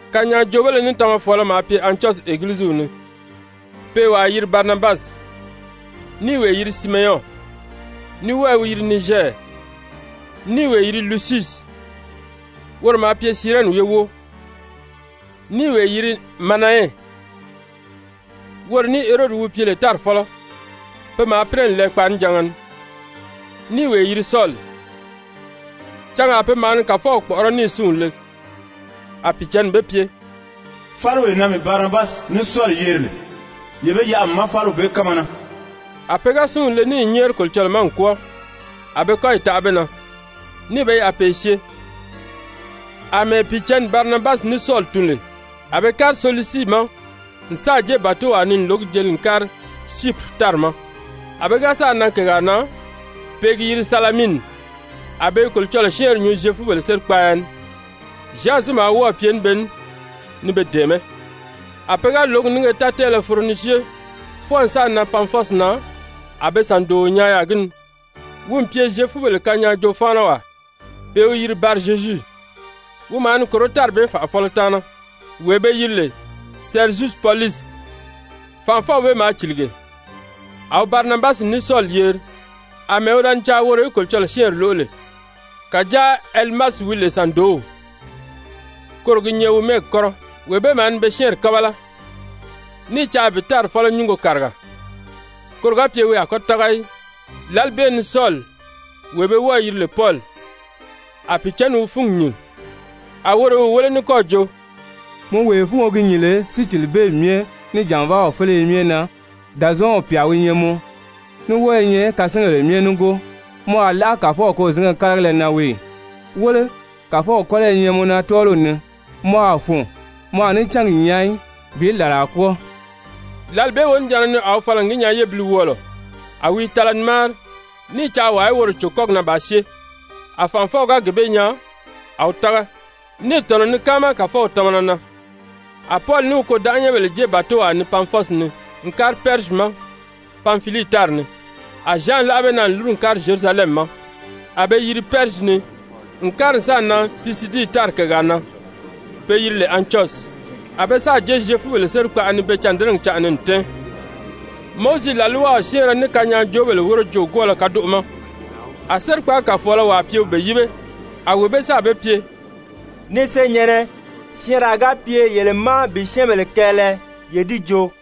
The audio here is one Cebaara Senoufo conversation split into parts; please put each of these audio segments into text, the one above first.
Kanyaajoobéle ní tamafɔɔlɔ maa pye Antyɔsyi Egiliziw ni, pe i wàa yiri Barinabasi, ní i wee yiri Simeyɔn, ní wɔ́ɔ i wi yiri Nizyɛri, ní i wee yiri Lusyusi, woro maa pye Sirɛni ye wóo, ní i wee yiri Manayɛn, woro ní Herodi wi pye lè tári fɔ́lɔ, pe maa pínɛ n lɛɛ kpaanijanga ni, ní i wee yiri Sɔli. Cangaa pe maa ni Kàfɔw kpɔ̀ʔɔrɔ́ níì súnw le, a Pìicǎnni be pye: «Fáliwee na mii Barinabasi ní Sɔli yeri lè, ye be yaʔa mii ma fáliw bee kánma na.» A pe ga súnw le níì nyɛ́ɛri Kolocɔlɔɔ ma n kwɔ́ɔ, a be kɔ́yi taʔa be na, níì be yaʔa pe i syée. Amɛɛ Pìicǎnni Barinabasi ní Sɔli tun lè, a be kári Selusii ma n sáà jée bàtowaa ni n lǒgi jeli n kári Syipiri tári ma. A pe ga sáà nan kègaa na pe i gi yiri Salamini, a be i Kolocɔlɔɔ syɛ́ɛnri nyuu Zyefubèle sérikpaaya ni. Zyan si maa wɔ́ɔ̀ pye ní be ní ni be dɛ̀ɛmɛ́. A pe ga lǒgi nínge tátɛɛlɛ foro ni syée fwɔɔ n sáà nan Pafɔsi na a be sàndooo nyaa yaà gi ni, wi n pye Zyefubèle kanyaajoo-fáanawaa, pe i wi yiri Barizyezu. Wi maa ni kòró tári bee fànʔafɔlɔ taana, wee be yiri lè Sɛrizyusi Pɔlusi, fànʔafɔw bee maa cìlige. A wi Barinabasi ní Sɔli yeri, àmɛɛ wi da ni caa woro í Kolocɔlɔɔ syɛ́ɛnri lóʔo lè. Kàjáa Elimasi wi lè sàndoow, (koro gi nyɛ wi mɛ́ɛgi kɔ́rɔ) wee bee maa ni be syɛ́ɛnri kábala, ní i caa bi tári fɔ́lɔ nyúngo kàriga, koro ga pye wi a kɔ́ tága í. Lǎli bee ni Sɔli, wee be wɔ́ɔ̄ yiri lè Pɔli, a Pìicǎnni wi fúngi nyìn, a woro i wi wéle ní kɔ́ɔ̀ jo: «Mɔ wee fúngo gi nyìn lè sícilibeemi myɛ, ní jànvaaw féleye myɛ na, Dàzɔɔnw pyà wi nyɛ mɔ, ní wɔ́ɔ i nyɛ kasingèle myɛ nígoo, mɔ a láʔa Kàfɔw kôzinge karigala na wii ì? Wéle, Kàfɔw kɔ́lɔ i nyɛ mɔ na tɔ́ɔliw ni, mɔ a fùun, mɔ a ní cángi nyaa í bi làlaa kwɔ́ɔ.» Lǎli bee wonijanna ni a wi fala n gi nyaa yébiliwɔɔlɔ, a wi i tala ni máari, ní i caa wàa í woro cò kɔ́gi na bàā syée. A fànʔafɔw ga gee bee nyaa, a wi tága, níì tɔ̀nɔ ni káama Kàfɔw tamana na. A Pɔli ní wi kôdanʔanyɛnbèle jée bàtowaa ni Pafɔsi ni n kári Pɛrizyi ma Panfilii tári ni. A Zyan láʔa be na n lúru n kári Zyerusalɛmi ma. A be yiri Pɛrizyi ni n kári n sáà nan Pisidii tári kègaa na be yiri lè Antyɔsyi. A be sáà jée Zyefubèle sérikpaʔa ni pe cândɛnɛgi canʔa ni n tɛ́ɛn. Mowizi làlwaw syɛ́ɛnrɛ ní kanyaajoobèle wóro joogwɔɔlɔ kadoʔo ma, a sérikpaagi kàfɔɔlɔ wàa pye wi be yíbe, a wee bee sáà be pye: «Ni senyɛ̀nnɛ, syɛɛnraa ga pye yele ma bi syɛ́ɛnbèle kɛɛlɛ, ye di joo.»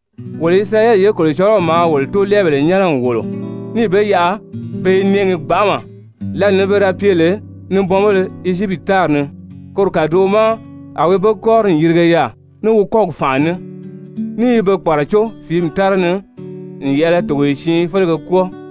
Wolo Isirayɛli ye Kolocɔlɔw maa wolo tóolɛɛbèle nyɛ́nɛ n wòlo, níì be yaʔa a be i nɛʔɛgi gbanʔama lǎli ni pe da pye lè nibɔnbéle Ezyipiti tári ni, koro kàdoʔo ma a wi be kɔ́ri n yirige yaà ní wi kɔ́gi fànʔa ní, ní i be kpàracó fìími tára ni n yɛ̀ʔɛlɛ togoye siin félege kwɔ́ɔ,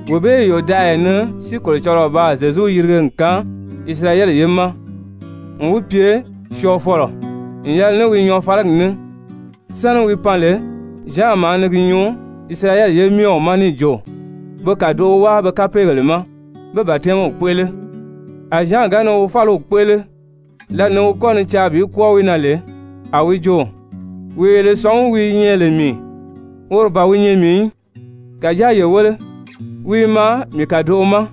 Wee bee yòdaʔaya ni si Kolocɔlɔɔ baa Zyezu yirige n kaan Isirayɛli ye ma n wi pye syɔɔfɔlɔ n yɛlɛ ní wi nyɔɔfaligi ní. Sáni wi pan lè, Zyan maa ni gi nyuu Isirayɛli ye myɛ ma níì jo be kàdoʔo wáa be kapeegèle ma, pé batɛmiw kpéʔele. A Zyan ga ni wi fáliw kpéʔele, lǎli ni wi kɔ́ ni caa bi kwɔ́ɔ wi na lè, a wi jo: ‹Wee yele sɔ̀ngí wi i nyɛ lè mii, woro ban wi nyɛ mii í. Kàjáa ye wéle, wi i maa mii kàdoʔo ma,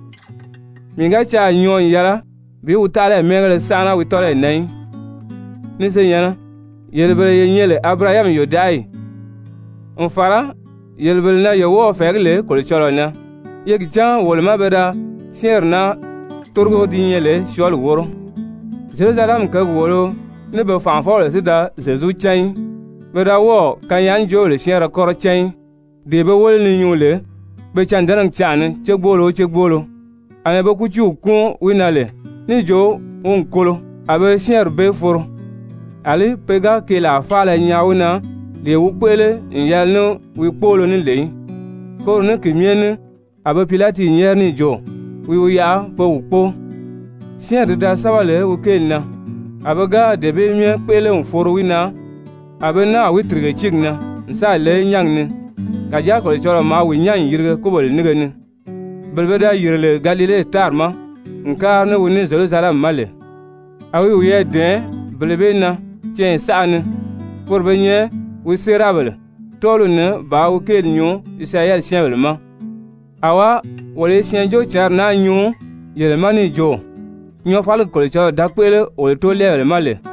mii ga caà nyɔɔ n yɛlɛ bi wi taʔalayi mɛ́ɛngéle sánʔana wi tɔ́lɔyi na í.› Ni senyɛ̀nnɛ, yele bele ye nyɛ lè Abirahami yòdaʔayi, n fàra yele bele na ye wɔ́ɔ̄ fɛ̀ɛgí lè Kolocɔlɔɔ na, ye gi cán wolo má pe da syɛ́ɛnri naa tórigo di nyɛ lè syɔɔli wóro. Zyerusalɛmi kěgi wòolo ní be fànʔafɔbèle si da Zyezu cán í, pe da wɔ́ɔ̀ kanyaajoobèle syɛ́ɛnrɛ kɔ́rɔ cán í, dee be wéle ni nyuu lè pe cândɛnɛgi canʔa ni cégbolo o cégbolo. Amɛɛ be kútiiw kúun wi na lè níì jo wi n kolo, a be syɛ́ɛnri bee foro. Alí pe ga keelaa faala nyaa wi na, lee wi kpéʔele n yɛlɛ ní wi kpóolo ní lè í, koro ní ki myɛ ní a be Pilati nyɛ́ɛri níì jo wi wi yaʔa pe wi kpóo. Syɛ́ɛnri ti da sɛ́bɛ lè wi kéeli na, a pe ga dee bee myɛ kpéʔele n foro wi na, a be náà wi tìrige tíigi na n sáà le nyángi ni. Kàjáa Kolocɔlɔɔ maa wi nyán n yirige kúbèle nínge ni. Bele pe da yìri lè Galile tári ma n kári ní wi ní Zyerusalɛmi ma lè, a wi wiyɛɛ dɛ̀ɛn bele bee na canya saʔa ni, poro be nyɛ wi séerabèle tɔ́ɔliw ni bàā wi kéeli nyuu Isirayɛli syɛ́ɛnbèle ma. Awá, wolo i Syɛɛnjóocǎnri naa nyuu yele ma níì jo: ‹Nyɔɔfaligi Kolocɔlɔɔ da kpéʔele wolo tóolɛɛbèle ma lè,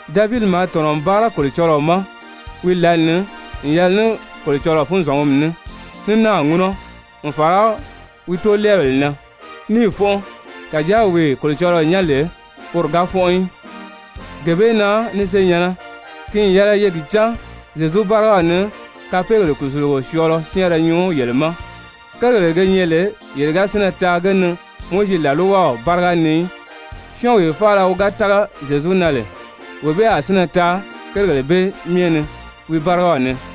Davidi maa tɔ̀nɔ n báara Kolocɔlɔɔ ma wi lǎli ni n yɛlɛ ní Kolocɔlɔɔ funzɔngumi ní, ní náà ŋúnɔ n fàra wi toolɛɛbèle na, níì fɔ́nʔɔ. Kàjáa wee Kolocɔlɔɔ nyán lè, woro ga fɔ́nʔɔ í. Gee bee na ni senyɛ̀nnɛ, ki n yɛlɛ ye gi cán Zyezu bárigaw ni kapeegèle kùsulugo syɔɔlɔ syɛ́ɛnrɛ nyuu yele ma. Kérigèle ge nyɛ lè ye ga sínnɛ taa ge ni Mowizi làlwaw báriga ni í, syɔ́ɔnwee faala wi ga tága Zyezu na lè, wee bee a sínnɛ taa kérigèle bee myɛ ni wi bárigaw ni.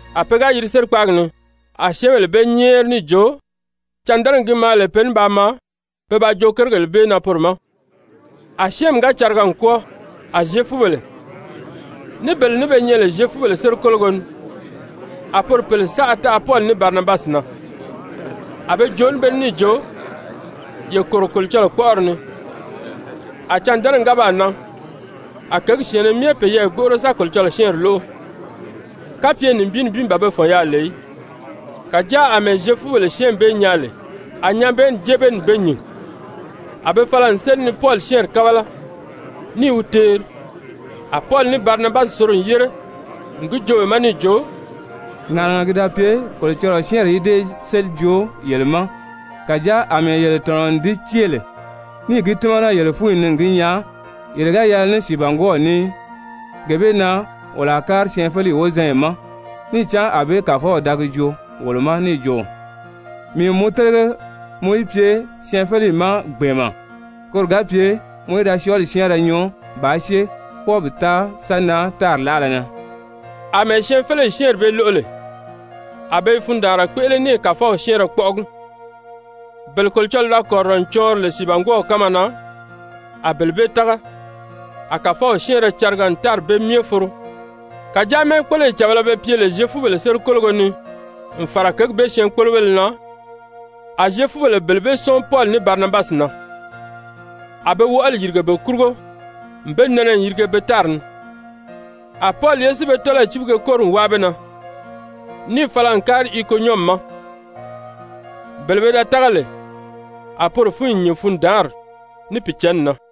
A pe ga yiri sérikpaagi ni, a syɛ́ɛnbèle be nyɛ́ɛri níì jo cândɛnɛgi gi maa lè pe ní paa maa pe ba joo kérigèle bee na poro ma. A syɛ́ɛnmi ga cariga n kwɔ́ɔ, a Zyefubèle, ní bele ní be nyɛ lè Zyefubèle sérikologo ni, a poro pèle saʔa taʔa Pɔli ní Barinabasi na, a be joo ní be ní níì jo: «Ye kòro Kolocɔlɔɔ kpɔ́ʔɔri ni.» A cândɛnɛgi ga baa nan, a kěgi syɛ̀ɛnnɛ myɛ peyɛɛ gbóʔoro sa Kolocɔlɔɔ syɛ́ɛnri lóʔo, kapye nibin nibin ban be fɔ̀n yaà lè í. Kàjáa àmɛɛ Zyefubèle syɛ́ɛnmi bee nyaa lè, a nyabɛɛnni jée be ni n be nyìn, a be fala n séli ni Pɔli syɛ́ɛnri kábala ní i wi teeri. A Pɔli ní Barinabasi soro n yére n gi joo be ma níì jo: «Ŋàʔanaga ki da pye Kolocɔlɔɔ syɛ́ɛnri í dée séli joo yele ma, kàjáa àmɛɛ yele tɔ̀nɔ n di cée lè níì gi tímana yele fúnyi ni n gi nyaa yele ga yɛlɛ ní sìibangwɔɔw ní í, gee bee na wolo a kári syɛɛnfeleyi wozanya ma. Níì cán ànbée Kàfɔw da gi joo wolo ma níì jo: ‹Mii n mɔ télege mɔ í pye syɛɛnfeleyi ma gbɛ̀ɛnmɛ, koro ga pye mɔ í da syɔɔli syɛ́ɛnrɛ nyuu bàā syée fwɔɔ bi taa sa nan tári láʔala na.›» Amɛɛ syɛɛnfeleyi syɛ́ɛnri bee lóʔo lè, a be i fundaanra kpéʔele ní i Kàfɔw syɛ́ɛnrɛ kpɔ́ʔɔgi, bele Kolocɔlɔɔ da kɔ̀rirɔ n cɔɔnri lè sìibangwɔɔw kánma na, a bele bee tága. A Kàfɔw syɛ́ɛnrɛ cariga n tári bee myɛ foro. Kàjáa mɛ́ɛkpoloyi càbala be pye lè Zyefubèle sérikologo ni n fàra kěgi bee syɛɛnkpolobéle na, a Zyefubèle bele bee sɔ́ɔn Pɔli ní Barinabasi na. A be wɔʔɔli yìrige be kurugo n be nɛnɛ n yirige be tari ni. A Pɔli ye si be tɔ́lɔyi cíbige kóri n wáa be na, níì fala n kári Ikonyɔmi ma. Bele pe da tága lè, a poro fúnyi nyìn fundaanri, ní Pìicǎnni na.